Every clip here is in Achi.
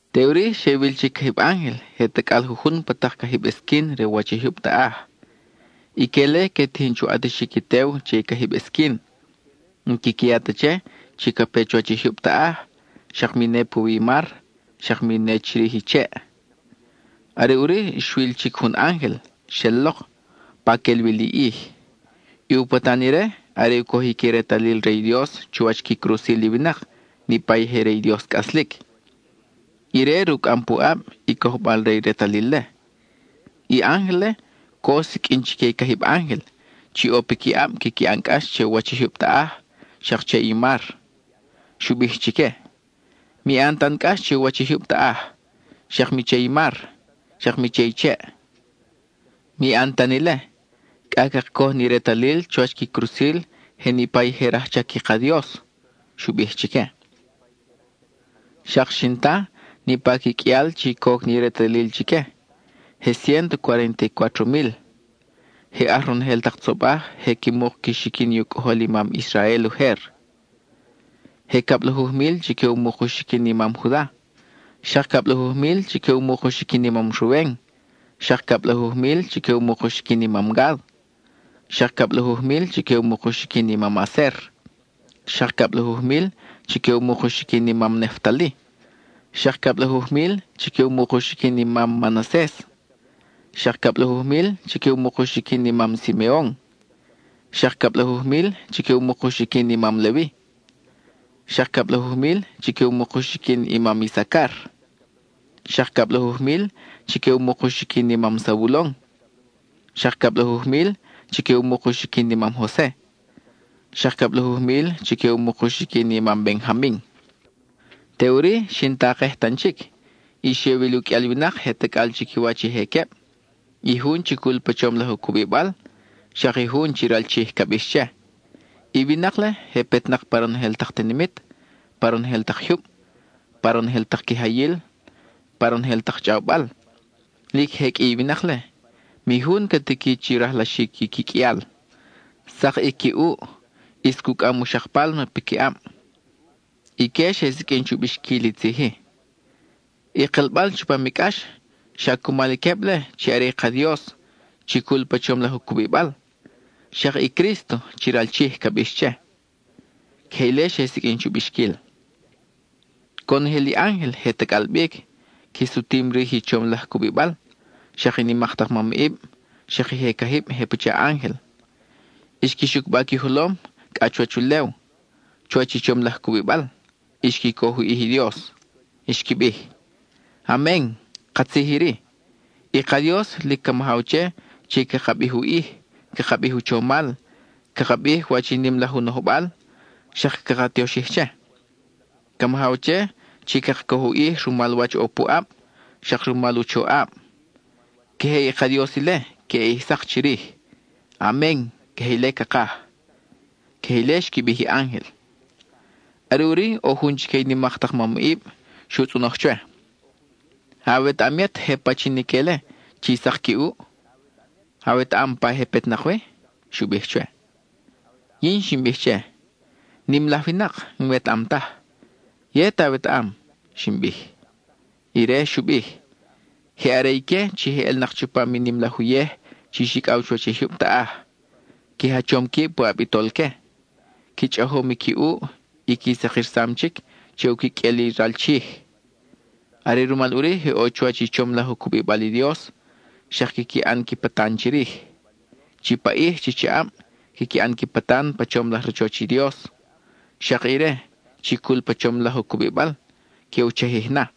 Teʼuri xe wil chic cajib ángel je tacʼal jujun pa tak cajib esquin re u wach i jyub taʼaj. Ique-le que tijin chu ʼatixic i tew che i cajib esquin. N-quiqui ya ta che chi ca pe chuwach i jyub taʼaj, xak mi ne puwi i mar, xak mi ne chirij i cheʼ. Are ʼuri xwil chic jun ángel, xel lok, pa quel wi li ʼij. I u patan ire, are u cojic i retalil re i Dios chuwach qui crusil i winak, niʼpa i je re i Dios cʼaslic. Ire rucʼam pu ʼab, i cojbal re i retalil-le. I ángel-le, co xsiqʼuin chique i cajib ángel, chi ʼo piquiʼab quiqui ʼan cʼax che u wach i jyub taʼaj, xak che i mar. Xu bij chique: —Mi ʼan tan cʼax che i u wach i jyub taʼaj, xak mi che i mar, xak mi che i cheʼ. Mi ʼan tan ile, cʼa caka coj ni retalil chuwach qui crusil je niʼpa i je rajchac i ka Dios —xu bij chique. Xak xin ta niʼpa qui qʼuial chi coc ni retalil chique: je ciénto cuarénta y cuátro mil. Je aj ronojel tak tzobaj je qui muk qui xiquin i u cʼojol i mam Israel ujer: Je cablajuj mil chique u muk u xiquin i mam Juda, xak cablajuj mil chique u muk u xiquin i mam Ruben, xak cablajuj mil chique u muk u xiquin i mam Gad, xak cablajuj mil chique u muk u xiquin i mam Aser, xak cablajuj mil chique u muk u xiquin i mam Neftali, xak cablajuj mil chique u muk u xiquin i mam Manases, xak cablajuj mil chique u muk u xiquin i mam Simeon, xak cablajuj mil chique u muk u xiquin i mam Levi, xak cablajuj mil chique u muk u xiquin i mam Isacar, xak cablajuj mil chique u muk u xiquin i mam Zabulon, xak cablajuj mil chique u muk u xiquin i mam Jose, xak cablajuj mil chique u muk u xiquin i mam Benjamin. Teʼuri xin takej tan chic, y xe wil u qʼuial winak je tacʼal chiquiwach i je queb (i jun chi cul pa chom laj u cubibal, xak i jun chi ral Chij ca bix che.) I winak-le je petnak pa ronojel tak tinimit, pa ronojel tak jyub, pa ronojel tak quijayil, pa ronojel tak chʼawbal. Lic je qʼui i winak-le, mi jun ca tiqui chi rajlaxic qui qʼuial. Sak i qui ʼuʼ; ʼis cucʼam u xak pálma piqui ʼab. Ique xe siqʼuin chu bixquil i tzij-i: I kelbal chupam i cʼax, xa cumal i queb-le chi are i ka Dios chi cul pa chom laj u cubibal, xak i Crísto, chi ral Chij ca bix che. (Queje ile xe siqʼuin chu bixquil.) Conojel i ángel je tacʼal bic, qui sutim rij i chom laj cubibal, xak i nimak tak mamʼib, xak i je cajib je pacha ángel. Xqui xucba qui jolom cʼa chuwach ulew, chuwach i chom laj cubibal, y xqui coj u ʼij i Dios; xqui bij: ¡Amen (katzij iri)! I ka Dios lic ca majaw che chi caka bij u ʼij, caka bij u chomal, caka bij wach i nim laj u nojbal, xak caka tioxij che. Ca majaw che chi caka coj u ʼij rumal wach ʼo puʼab, xak rumal u choʼab. Queje i ka Dios ile queʼe ʼij sak chirij. Amen (queje ile cakaj). (Queje ile xqui bij i ángel.) Are ʼuri ʼo jun chique i nimak tak mamʼib xu tzʼonoj chwe: —¿Awetaʼam yet je pachin ique-le chi sak qui ʼuʼ? ¿Awetaʼam pa je petnak wi? —xu bij chwe. Yin xin bij che: —Nim laj winak, n-wetaʼam taj. Yet awetaʼam —xin bij. Ire xu bij: —Je are ique chi je ʼelnak chupam i nim laj uyej chi xicʼaw chuwach i jyub taʼaj. (Qui jachom quib puʼab i Tolque.) Qui chʼajom i qui ʼuʼ, y qui sakirsam chic che u quiqʼuel i ral Chij. Are rumal ʼuri je ʼo chuwach i chom laj u cubibal i Dios, xak quiqui ʼan qui patan chirij. Chi paʼij chi chaʼab quiqui ʼan qui patan pa chom laj rachoch i Dios; xak ire, chi cul pa chom laj u cubibal, que u chajij na.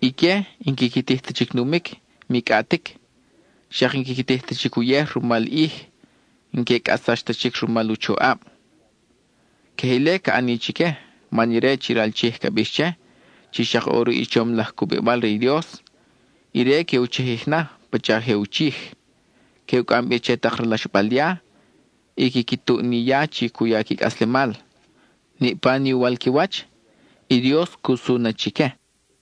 Ique n-quiqui tij ta chic numic, mi cʼatic; xak n-quiqui tij ta chic uyej rumal i ʼij; n-que cʼatsax ta chic rumal u choʼab. Queje ile ca ʼani chique, man ire chi ral Chij ca bix che (chi xak ʼo ruʼ i chom laj cubibal re i Dios), ire que u chajij na pacha je u chij; que u cʼam bi che tak ralaxbal ya, y quiqui tuʼ ni ya chi cu ya qui cʼaslemal. Niʼpa ni uwal qui wach, i Dios cu su na chique.